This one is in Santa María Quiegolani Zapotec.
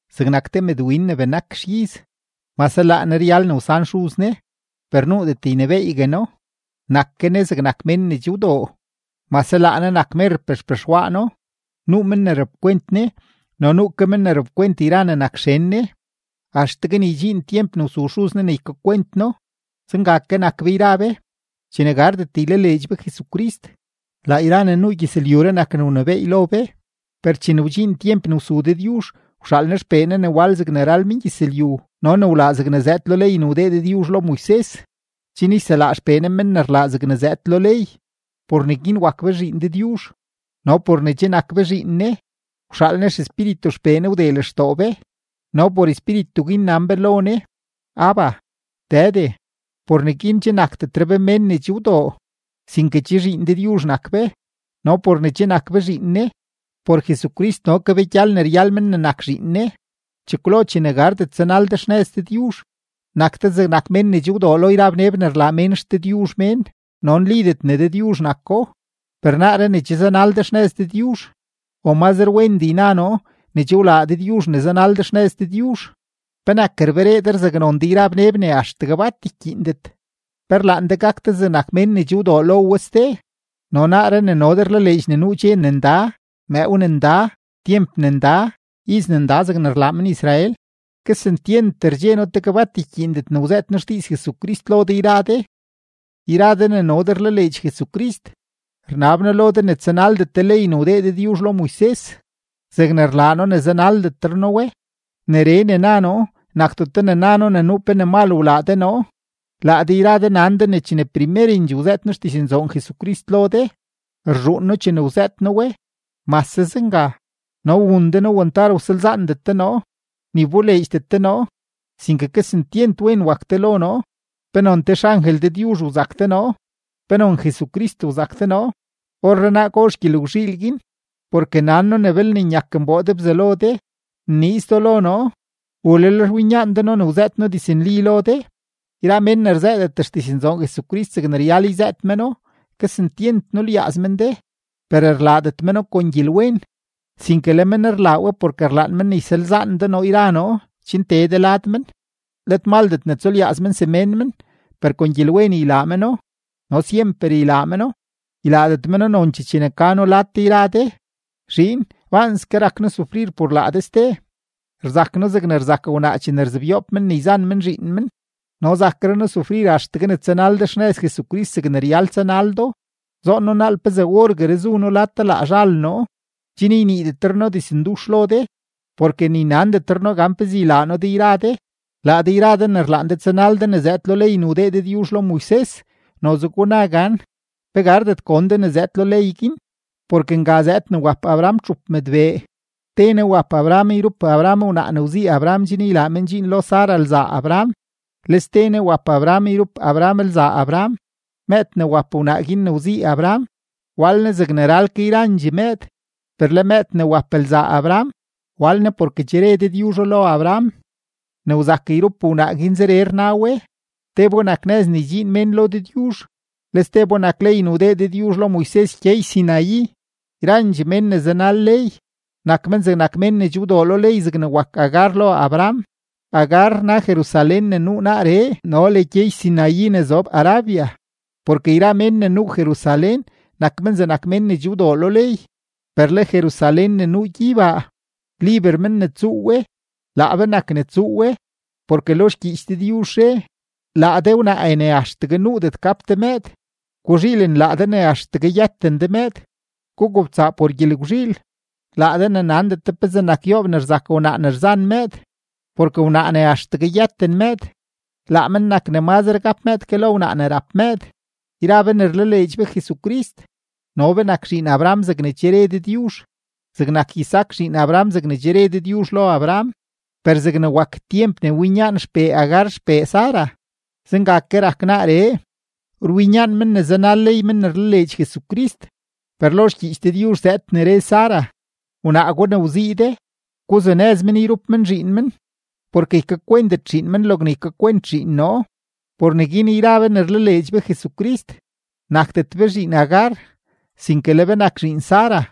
Zegnak te mëdwin ne benak xiz, mase laa ne ryal ne wsan xuz ne, per nuudet ynebééygue no, nak ke ne zegnak mén ne che wdoo, mase laa ne nak merpee xpexwaano. Nuu men ne rapkwent ne no nuu ke men ne rapkwent yra ne nak xen ne, axtegue ne ydxiin tyemp ne wsu xuz ne ne ykakwent no. Zenga ke nak be yra be. Chene gardet ylaleedx be Jesucrist, laa yra ne nuu gyëzlyuree nak ne wnebééy lo be. Per chene wdxiin tyemp ne wsu Dëdyuzh, wxaal Ne XPee Ne ne wal zegne ral mengyëzlyu no ne wlaa zegne zëëd lo ley ne wdee Dëdyuzh lo Moises, chen yselaa XPee Ne men ne rlaa zegne zëëd lo ley, por neguin wak be zhiin Dëdyuzh. No por ne che nak be zhiin Ne, wxaal Ne XEspíritu XPee Ne wdee lextoo be, no por Espíritu guin nan be lo Ne: “¡Abba, Dëde!” Por neguin che nakdetre be mén ne che wdoo, sinke che zhiin Dëdyuzh nak be; no por ne che nak be zhiin Ne, por Jesucrist no ke be gyal ne ryal men ne nak zhiin Ne. Chekwlo chene gardet tsanal de xnëz Dëdyuzh, nak de zegnak mén ne che wdoo lo yra bneb ne rlaa mén xdëdyuzh mén no nlidet ne dëdyuzh nako. Per naaree ne che zanal de xnëz Dëdyuzh, o mazre wendee yna noo ne che wlaa Dëdyuzh ne zanal de xnëz Dëdyuzh, ¿penak rberee de rzaknon de yra bneb ne axtegue bat rkyiindet? ¿Pe rlaan de gak de zegnak mén ne che wdoo lo we ste? No naaree ne no de rlaleedx ne nuu dxe ne nda, mëëw ne nda, tyemp ne nda, iz ne nda zegne rlaa men-Israel, kesentyent rdxe noo tegue bat ykyiindet ne wzëët noo xdiiz Jesucrist lo de yra de. Yra de ne no de rlaleedx Jesucrist, rnab noo lo de ne tsanaldet de ley ne wdee Dëdyuzh lo Moises zegne rlaa noo ne zanaldetre noo we. Neree ne na noo nakdeto ne na noo ne nuu pe ne mal wlaa de noo. Laa de yra de nan de ne chene primerendxee wzëët noo xdiznzoon Jesucrist lo de, rzhuun noo chene wzëët noo we. Mase zenga, no wun de noo wantar wsalzaandet de noo, ni wboleedxdet de noo, sinke kesentyent wen wak de lo noo, penon te xangel Dëdyuzh wzak de noo, penon Jesucrist wzak de noo. ¿Orrenaa gozh gyelgwzhiil guin? Porke nan noo ne belne nyak nboo de bzalo de, nniiz do lo noo. ¿U lel rwinyaan de noo ne wzëët noo diznli lo de? Yra mén ne rzëëdet xdiznzoon Jesucrist zegne ryal yzëët meno, kesentyent nulyaaz men de, per rlaadet meno kon gyelwen, sinke le men rlaa we porke rlaan men ne ysalzaan de noo yra noo chen tee de lad men. Let maldet ne tsulyaaz men semén men, per kon gyelwen ylaa meno no syemper ylaa meno, ylaadet meno nonchee chene ka noo lad de yra de. Zhiin, baanske rak noo sufrir por laa de ste, rzak noo zegne rzak wnaa chene rzebyoob men ne rzan men zhiin men, no zakre noo sufrir axtegue ne tsanal de xnëz Jesucrist zegne ryal tsanal do. ¡Zoon noo naal pezee orgueree zu noo lad de laa zhal noo, chen yniidetre noo dizndux lo de, porke ni nandetre noo gan pezee ylaa noo de yra de! Laa de yra de ne rlaan de tsanal de yra ne zëëd lo ley ne wdee Dëdyuzh lo Moises, noze guna gan ¿pe gardet gon de ne zëëd lo ley guin? Porke nga zëëd ne wap Abraham txup mëdbee: te ne wap Abraham yrup Abraham wnaa ne wzii Abraham chen ylaa men dxiin lo Sara lzaa Abraham, le ste ne wap Abraham yrup Abraham lzaa Abraham. Mëëd ne wap wnaa guin ne wzii Abraham, wal ne zegne ral ke yrandxee mëëd, per le mëëd ne wap lzaa Abraham, wal ne porke che re Dëdyuzho lo Abraham. Ne wzak yrup wnaa guin zeree rna we: Tebo nak nëz ne ydxiin mén lo Dëdyuzh; le stebo nak ley ne wdee Dëdyuzh lo Moises gyey-Sinaí; yrandxee mén ne zanal ley, nak men zegnak mén ne che wdoo lo ley zegne wak Agar lo Abraham. Agar rna Jerusalén ne nuu naaree no le gyey-Sinaí ne zob Arabia, porke yra mén ne nuu Jerusalén nak men zegnak mén ne che wdoo lo ley. Per le Jerusalén ne nuu gyeybaa, liber men ne tsuu we, laa be nak ne tsuu we. Porke lo xgyiich Dëdyuzh re: Laa de wnaae ne axtegue nuudet gap de mëëd, guzhiilen laa de ne axtegue yëten de mëëd; gugobtsaa por gyelgwzhiil, laa de ne nandet de pezee nak yoob ne rzak wnaa ne rzan mëëd, porke wnaa ne axtegue yëten mëëd, laa men nak ne mazre gap mëëd ke lo wnaa ne rap mëëd. Yra be ne rlaleedx be Jesucrist, no be nak zhiin Abraham zegne che re Dëdyuzh, zegnak Isaac zhiin Abraham zegne che re Dëdyuzh lo Abraham. Per zegne wak tyemp guin ne winyaan xpee Agar xpee Sara, zenga ke rak naaree: Rwinyaan men ne zanal ley men ne rlaleedx Jesucrist. Per lo xgyiich Dëdyuzh zëëd ne re Sara: “Wnaa gwa ne wzii de, guzunëz men yrup men zhiin men, porke ykakwentet zhiin men logne ykakwent zhiin noo.” Por neguin yra be ne rlaleedx be Jesucrist, nakdet be zhiin Agar, sinke le be nak zhiin Sara.